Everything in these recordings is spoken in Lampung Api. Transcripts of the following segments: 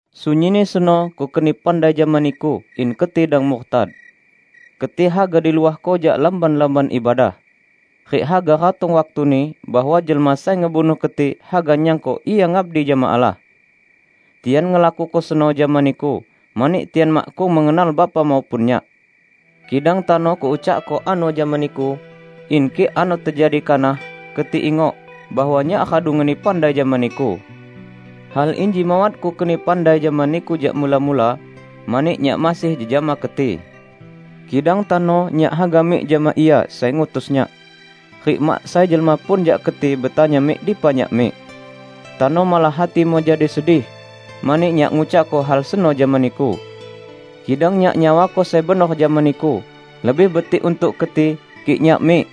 Sunyinni seno Kukeni pandai jama niku in keti dang murtad. Keti haga diluahko jak lamban-lamban ibadah. Rik haga ratong waktuni bahwa jelma sai ngebunuh keti haga nyangko ia ngabdi jama Allah. Tian ngelakuko seno jama niku mani tian makkung mengenal Bapa maupun Nyak. Kidang tano Kuucakko ano jama niku, in kik ano tejadi kanah, keti ingok bahwa Nyak radu ngeni pandai jama niku." "Hal inji mawat Kukeni pandai jama niku jak mula-mula, mani Nyak masih jejama keti. Kidang tano Nyak haga mik jama Ia sai ngutus Nyak; rik mak sai jelma pun jak keti betanya mik dipa Nyak mik. Tano malah hatimu jadi sedih, mani Nyak ngucakko hal seno jama niku. Kidang Nyak nyawako sai benor jama niku: Lebih betik untuk keti, kik Nyak mik;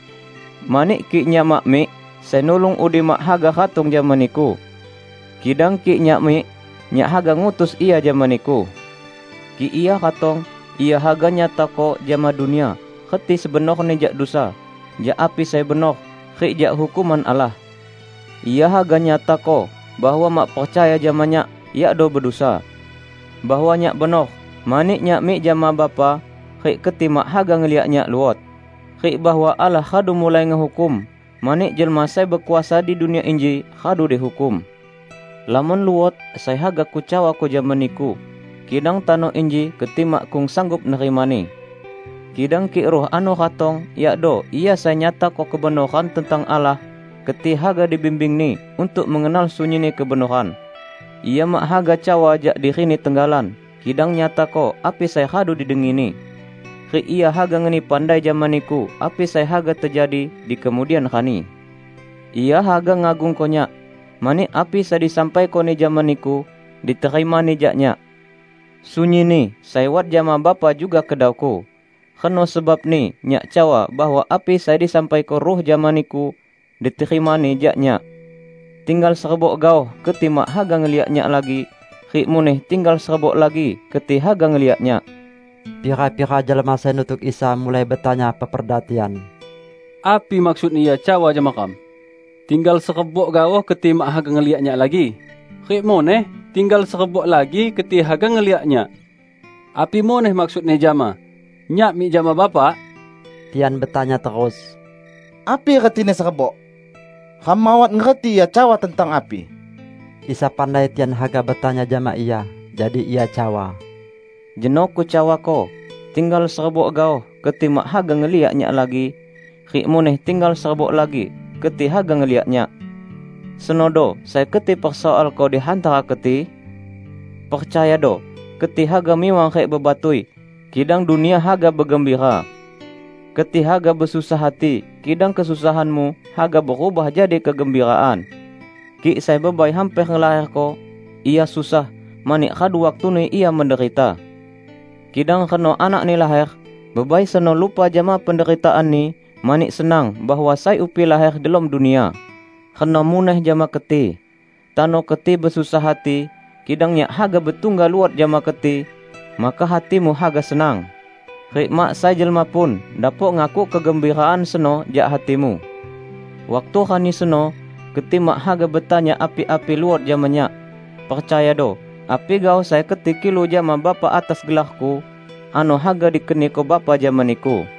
mani kik Nyak mak mik, Sai Nulung udi mak haga ratong jama niku. Kidang kik Nyak mik, Nyak haga ngutus Ia jama niku. Kik Ia ratong, Ia haga nyatako jama dunia reti sebenorni jak dusa, jak api sai benor, rik jak hukuman Allah. Ia haga nyatako bahwa mak percaya jama Nyak yakdo bedusa; bahwa Nyak benor, mani Nyak mik jama Bapa rik keti mak haga ngeliak Nyak luot; rik bahwa Allah radu mulai ngehukum, mani jelma sai bekuasa di dunia inji radu dihukum. Lamon luot sai haga Kucawako jama niku, kidang tano inji keti makkung sanggup nerimani. Kidang kik Ruh ano ratong, yakdo Ia sai nyatako kebenoran tentang Allah, keti haga dibimbing-Ni untuk mengenal sunyinni kebenoran. Ia mak haga cawa jak diri-Ni tenggalan kidang nyatako api sai radu didengi-Ni, rik Ia haga ngeni pandai jama niku api sai haga tejadi dikemudian rani. Ia haga ngagungko Nyak, mani api sai disampaiko-Ni jama niku, diterima-Ni jak Nyak. Sunyinni sai wat jama Bapa juga kedau-Ku. Reno sebabni Nyak cawa bahwa api sai disampaiko Ruh jama niku, diterima-Ni jak Nyak." "Tinggal serebok gaoh keti mak haga ngeliak Nyak lagi, rik muneh tinggal serebok lagi keti haga ngeliak Nyak." Pira-pira jelma sai nutuk Isa mulai betanya peperda tian, "Api maksudni Ia cawa jama ram: 'Tinggal serebok gaoh keti mak haga ngeliak Nyak lagi, rik muneh tinggal serebok lagi keti haga ngeliak Nyak'? Api muneh maksudni jama: 'Nyak mik jama Bapa'?" Tian betanya terus, "Api retini, 'serebok'? Ram mawat ngerti Ia cawa tentang api!" Isa pandai tian haga betanya jama Ia. Jadi Ia cawa, "Jeno Kucawako, 'Tinggal serebok gaoh, keti mak haga ngeliak Nyak lagi, rik muneh tinggal serebok lagi keti haga ngeliak Nyak.' Senodo sai keti persoalko di hantara keti? Percayado, keti haga miwang rik bebatui, kidang dunia haga begembira. Keti haga besusah hati, kidang kesusahanmu haga berubah jadi kegembiraan. Kik sai bebai hamper ngelaherko, ia susah, mani radu waktuni ia menderita. Kidang reno anakni laher, bebai seno lupa jama penderitaanni mani senang bahwa sai upi laher delom dunia. Reno muneh jama keti: Tano keti besusah hati, kidang Nyak haga betungga luot jama keti, maka hatimu haga senang; rik mak sai jelma pun dapok ngakuk kegembiraan seno jak hatimu. Waktu rani seno, keti mak haga betanya api-api luot jama Nyak. Percayado: Api gaoh sai keti kilu jama Bapa atas gelar-Ku, ano haga dikeniko Bapa jama niku.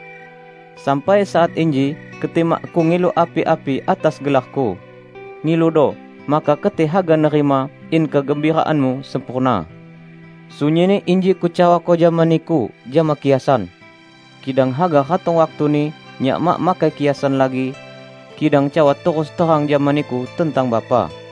Sampai saat inji keti makkung ngilu api-api atas gelar-Ku. Ngiludo, maka keti haga nerima, in kegembiraanmu sempurna." "Sunyinni inji Kucawako jama niku jama kiasan. Kidang haga ratong waktuni, Nyak mak makai kiasan lagi, kidang cawa terus terang jama niku tentang Bapa.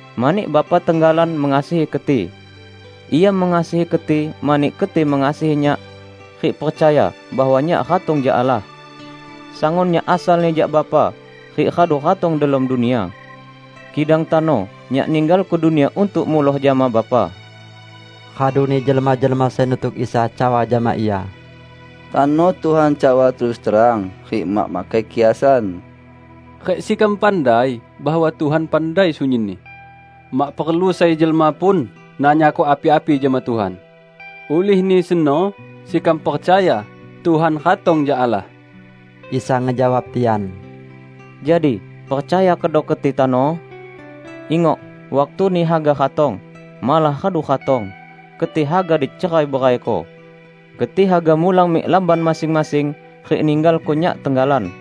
mani Bapa tenggalan mengasihi keti. Ia mengasihi keti mani keti mengasihi Nyak, rik percaya bahwa Nyak ratong jak Allah. Sangun Nyak asalni jak Bapa, rik radu ratong delom dunia. Kidang tano Nyak ninggalko dunia untuk muloh jama Bapa." Raduni jelma-jelma sai nutuk Isa cawa jama Ia, "Tano Tuhan cawa terus terang rik mak makai kiasan, rik sekam pandai bahwa Tuhan pandai sunyinni. Mak perlu sai jelma pun nanyako api-api jama Tuhan. Ulihni seno sekam percaya Tuhan ratong jak Allah." Isa ngejawab tian, "Jadi percaya kedo keti tano? Ingok! Waktuni haga ratong, malah radu ratong, keti haga dicerai-beraiko. Keti haga mulang mik lamban masing-masing rik ninggalko Nyak tenggalan.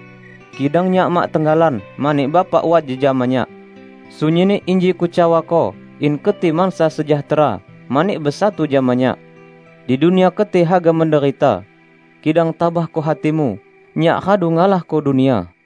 Kidang Nyak mak tenggalan mani Bapa wat jejama Nyak. Sunyinni inji Kucawako in keti mansa sejahtera mani besatu jama Nyak. Di dunia keti haga menderita. Kidang tabahko hatimu! Nyak radu ngalahko dunia!"